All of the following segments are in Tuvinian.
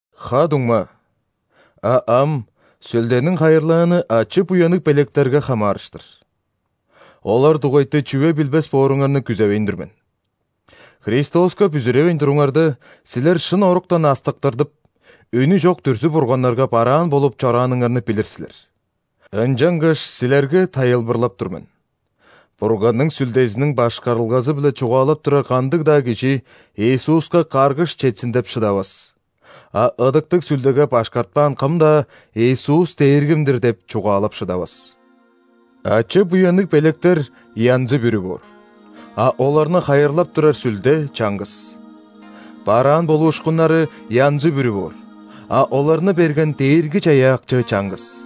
Ха-дуңма, а ам Сүлдениң хайырлааны ачы-буянныг белектерге хамаарыштыр. Олар дугайты чүве билбес бооруңарны күзевейн тур мен. Христоска бүзүревейн туруңарда, силер шын оруктан астыктырдып, үнү чок дүрзү-бурганнарга бараан болуп чорааныңарны билир силер. Ынчангаш силерге тайылбырлап тур мен: Бурганның Сүлдезиниң башкарылгазы-биле чугаалап турар кандыг-даа кижи «Иисуска каргыш четсин» деп шыдавас, а Ыдыктыг Сүлдеге башкартпаан кым-даа: «Иисус – Дээргим-дир» – деп чугаалап шыдавас. Ачы-буянныг белектер янзы-бүрү боор, а оларны хайырлап турар Сүлде чаңгыс. Бараан болуушкуннары янзы-бүрү боор, а оларны берген Дээрги-Чаяакчы чаңгыс.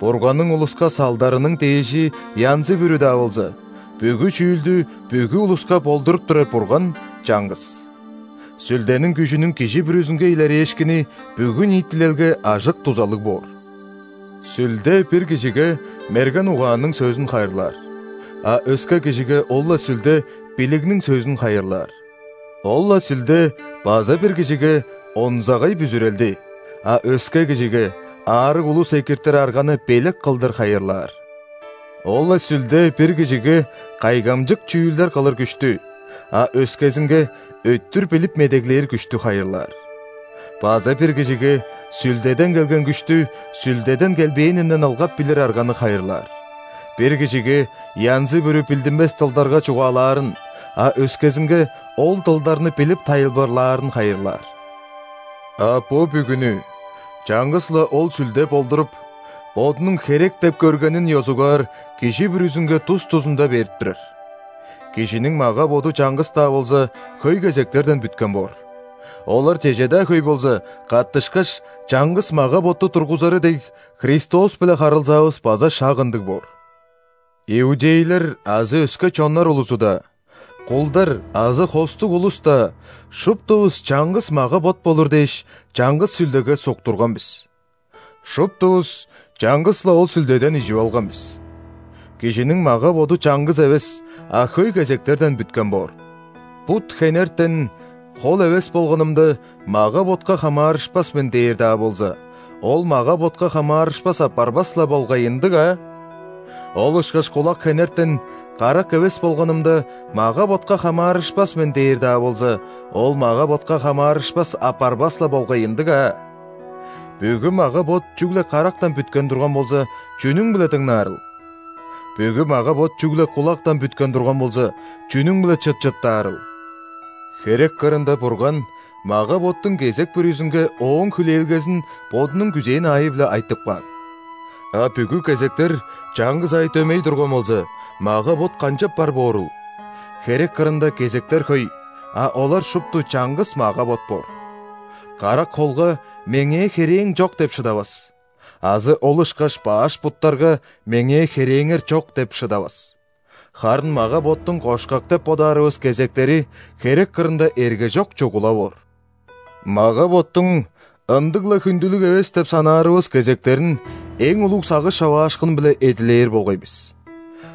Бурганның улуска салдарының дээжи янзы-бүрү-даа болза, бүгү чүүлдү бүгү улуска болдуруп турар Бурган – чаңгыс. Сүлдениң күжүнүң кижи бүрүзүнге илерээшкини бүгү ниитилелге ажык-дузалыг боор. Сүлде бир кижиге мерген угаанның сөзүн хайырлаар, а өске кижиге ол-ла Сүлде билигниң сөзүн хайырлаар. Ол-ла Сүлде база бир кижиге – онзагай бүзүрелди, а өске кижиге – аарыг улус экиртир арганы белек кылдыр хайырлаар. Ол-ла Сүлде бир кижиге – кайгамчык чүүлдер кылыр күштү, а өскезинге – өттүр билип медеглээр к��штү хайырлаар. База бир кижиге – Сүлдеден келген күштү Сүлдеден келбээнинден ылгап билир арганы хайырлаар. Бир кижиге – янзы-бүрү билдинмес дылдарга чугаалаарын, а өскезинге – ол дылдарны билип, тайылбырлаарын хайырлаар. А бо бүгүнү чаңгыс-ла ол Сүлде болдуруп, Бодунуң херек деп көргенин ёзугаар кижи бүрүзүнге тус-тузунда берип турар. Кижиниң мага-боду чаңгыс-даа болза, хөй кезектерден бүткен боор. Олар чеже-даа хөй болза, каттышкаш, чаңгыс мага-ботту тургузары дег, Христос-биле харылзаавыс база шак ындыг боор. Иудейлер азы өске чоннар улузу-даа, кулдар азы хостуг улус-даа, шуптувус чаңгыс мага-бот болур дээш, чаңгыс Сүлдеге суктурган бис. Шуптувус чаңгыс-ла ол Сүлдеден «ижип алган бис». Кижиниң мага-боду чаңгыс эвес, а хөй кезектерден бүткен боор. Бут хенертен: «Хол эвес болганымда, мага-ботка хамаарышпас мен» – дээр-даа болза, ол мага-ботка хамаарышпас апарбас-ла болгай, ындыг аа? Ол ышкаш кулак хенертен: «Карак эвес болганымда, мага-ботка хамаарышпас мен» – дээр-даа болза, ол мага-ботка хамаарышпас апарбас-ла болгай, ындыг аа? Бүгү мага-бот чүгле карактан бүткен турган болза, чүнүң-биле дыңнаарыл? Бүгү мага-бот чүгле кулактан бүткен турган болза, чүнүң-биле чыт чыттаарыл? Херек кырында Бурган мага-боттуң кезек бүрүзүнге ооң хүлээлгезин Бодунуң күзээн аайы-биле айтып каан. А бүгү кезектер чаңгыс аай дөмей турган болза, мага-бот канчап бар боорул? Херек кырында кезектер хөй, а олар шупту чаңгыс мага-бот боор. Карак холга: «Меңээ херээң чок!» – деп шыдавас. Азы ол ышкаш баш буттарга: «Меңээ херээңер чок!» – деп шыдавас. Харын мага-боттуң кошкак деп бодаарывыс кезектери херек кырында эргежок чугула боор. Мага-боттуң ындыг-ла хүндүлүг эвес деп санаарывыс кезектерин эң улуг сагыш човаашкын-биле эдилээр болгай бис.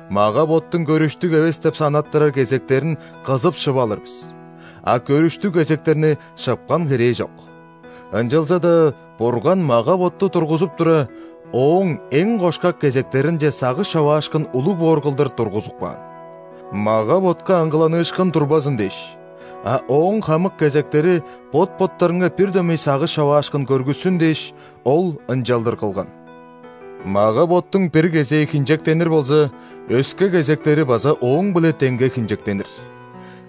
Мага-боттуң көрүштүг эвес деп санаттырар кезектерин кызып шып алыр бис, а көрүштүг кезектерни шыпкан херээ чок. Ынчалза-даа Бурган мага-ботту тургузуп тура, ооң эң кошкак кезектеринче сагыш човаашкын улуг боор кылдыр тургузуп каан. Мага-ботка аңгыланыышкын турбазын дээш, а ооң хамык кезектери бот-боттарынга бир дөмей сагыш човаашкын көргүссүн дээш, Ол ынчалдыр кылган. Мага-боттуң бир кезээ хинчектенир болза, өске кезектери база ооң-биле деңге хинчектенир;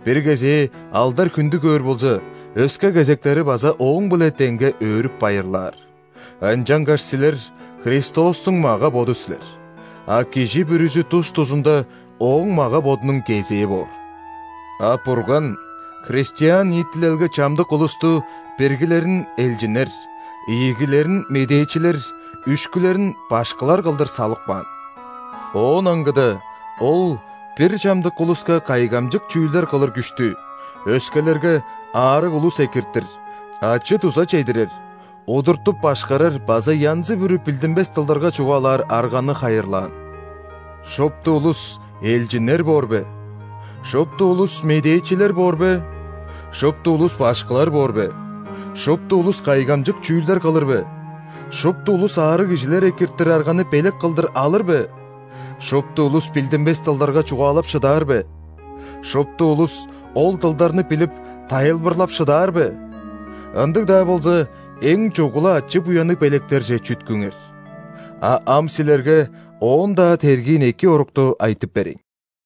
бир кезээ алдар-хүндү көөр болза, өске кезектери база ооң-биле деңге өөрүп-байырлаар. Ынчангаш силер – Христостуң мага-боду силер, а кижи бүрүзү тус-тузунда Ооң мага-бодунуң кезээ боор. А Бурган христиан ниитилелге чамдык улусту: биргилерин – элчиннер, ийигилерин – медээчилер, үшкүлерин – башкылар кылдыр салып каан. Оон аңгыда Ол бир чамдык улуска кайгамчык чүүлдер кылыр күштү, өскелерге – аарыг улус экиртир, ачы-дуза чедирер, удуртуп-башкарар база янзы-бүрү билдинмес дылдарга чугаалаар арганы хайырлаан. Шупту улус элчиннер боор бе? Шупту улус медээчилер боор бе? Шупту улус башкылар боор бе? Шупту улус кайгамчык чүүлдер кылыр бе? Шупту улус аарыг кижилер экиртир арганы белек кылдыр алыр бе? Шупту улус билдинмес дылдарга чугаалап шыдаар бе? Шупту улус ол дылдарны билип, тайылбырлап шыдаар бе? Ындыг-даа болза, эң чугула ачы-буянныг белектерже чүткүңер. А ам силерге оон-даа тергиин эки орукту айтып берейн.